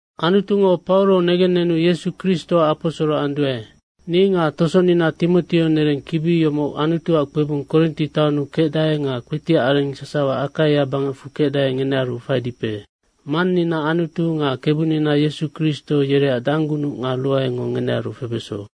Anutungo Pauro negennenu Yesu Kristoac aposoro anduae. Ni nga tosonina Timoteo, nereng kibi yomoc Anutuac kpebung Korinti taonnu kecdae nga kpetiac areng sasawa Akaia bangecfu kecdae, ngenearu faidipe. Mannina Anutu nga Kebunina Yesu Kristo, yereac danggunuc nga ruaengo ngenearu febeso.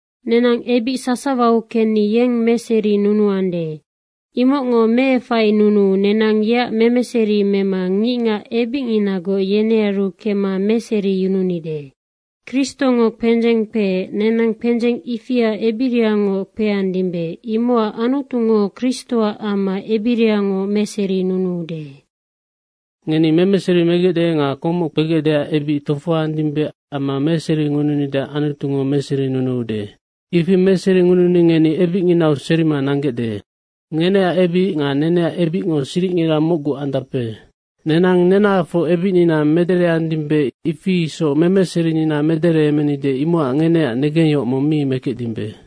Nenang ebic sasawau kecni yeng meserinunuande. Imocngo meefainunuu nenang yeac memeseri mema ngicngac ebicnginagoc yenearu kemma meseriyununide. Kristongo kpendzeng kpeec, nenang kpendzeng ifia ebirangoc kpeandimbe, imocac Anutungo Kristoac amma ebirangoc meserinunuude. Ngeni memeseri megecde nga komoc kpegecdeac ebic tofohoandimbe amma meseringununideac Anutungo meserinunuude. Ifi meseringununi ngeni ebicnginau serima nanggecde. Ngeneac ebic nga neneac ebicngo siricngira mocgu andape. Nenang nenahafoc ebicnina medereandimbe, ifi isoc memeserinina medereemenide, imocac ngeneac negengyohoc mong mi mekecdimbe.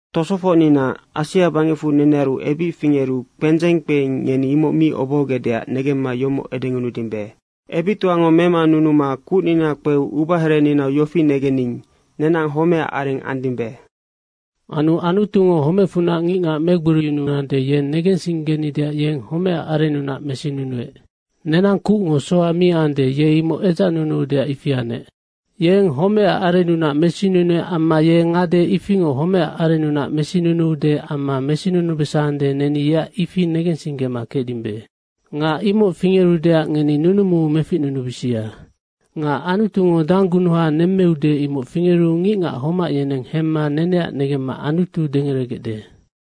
Tosofocnina, Asia bangecfu nenearu ebic fingeru kpendzeng kpeing, ngeni imoc mi obohogecdeac negemma yomoc edengunudimbe. Ebictoango memanunuma kucnina kpeu ubahereninau yofi negening, “Nenang homecac areng andimbe.” Anu Anutungo homecfunac ngicngac megboriyunuande, ye negensinggenideac yeng homecac arennunac mesinunuec. Nenang kucngo soha mi ande, ye imoc edzacnunuudeac ifi anec. Yeng homecac arennunac mesinunuec amma ye ngade ifingoc homecac arennunac mesinunuude amma mesinunubesande, neni yeac ifi negensinggema kecdimbe. Nga imoc fingerudeac ngeni nunumuu meficnunubisia. Nga Anutungo danggunuha nemmeude, imoc fingeru ngicngac homac yeneng hemma neneac negemma Anutu dengeregecde.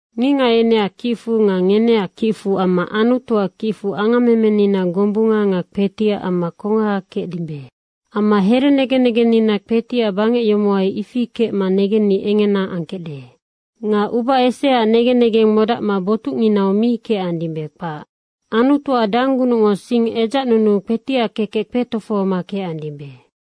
Ngicngac yeneac kicfu nga ngeneac kicfu amma Anutuac kicfu angammemenina gombunga nga kpetiac amma kongaha kecdimbe. Amma here negen negennina kpetiac bangec yomohai ifi kecma negenni engena angkecde. Nga uba eseaac negen negeng modacma botucnginau mi kecandimbe, kpac. Anutuac danggunucngo sing edzacnunuu kpetiac kekec kpetofohoma kecandimbe.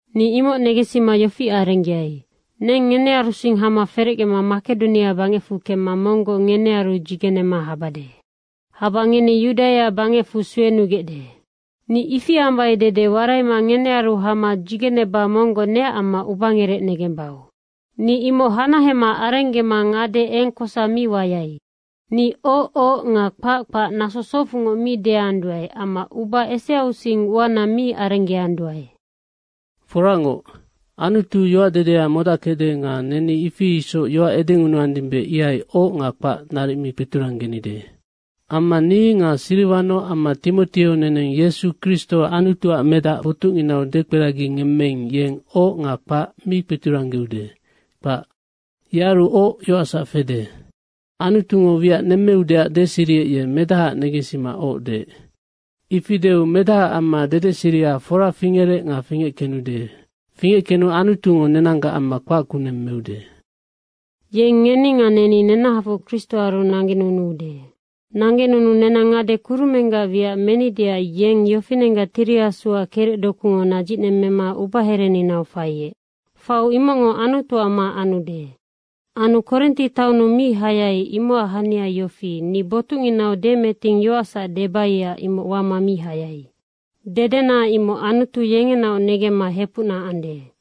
Ni imoc negensima yofi arenggeai, neng ngenearusing hama ferecgema Makedonia bangecfu kembade. Kemma monggoc ngenearu dzigenema habade. Haba ngeni Yudaia bangecfu suenugecde. Ni ifi ambai dede waraima ngenearu hama dzigeneba monggoc neac amma ubangerec negembau. Ni imoc hanahema arenggema ngade eng kosa mi wayai. Ni “oc, oc” nga “kpac, kpac” naso socfungoc mi deanduae amma uba eseausing uana mi arenggeanduae. Foracngoc, Anutu yoacdedea modackecde nga neni ifi isoc yoac edengunuandimbe, ihai “Oc” nga “Kpac” naric mi kpeturanggenide. Amma ni nga Siriwano amma Timoteo, neneng Yesu Kristo Anutuac Medac botucnginau dekperagingemmeing, yeng “Oc” nga “Kpac” mi kpeturanggeude, kpac. Yearu oc yoacsac fede. Anutungo wiac nemmeudeac deseriec, ye medahaac negensima “Oc” deec. Ifi deu Medahaac amma dedeseria fora fingerec nga fingeckenude. Fingeckenu Anutungo nenanggac amma kpac kuneng meude. Yeng ngeni nga neni nenahafoc Kristoaru nanggenunuude. Nanggenunuu nenang ngade kurumenggac wiac menideac yeng yofinenggac Tiri Asuac kerecdokuyango nadzicnemmema ubahereninau faiec. Faiu imocngo Anutuac ma anude. Anu Korinti amau mi hayai, imocac hania yofi, ni botucnginau demeting yoacsac debaiac imoc wama mi hayai. Dedena imoc Anutu yengenaoc negemma hepucna ande.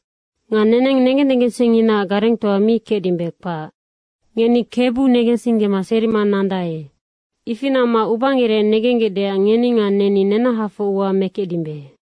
Nga neneng negen negensingnginaac garengtoa mi kecdimbe, kpac. Ngeni Kebu negensinggema serima nandae. Ifi namma ubangerec negenggecdeac ngeni nga neni nenahafoc ua mekecdimbe.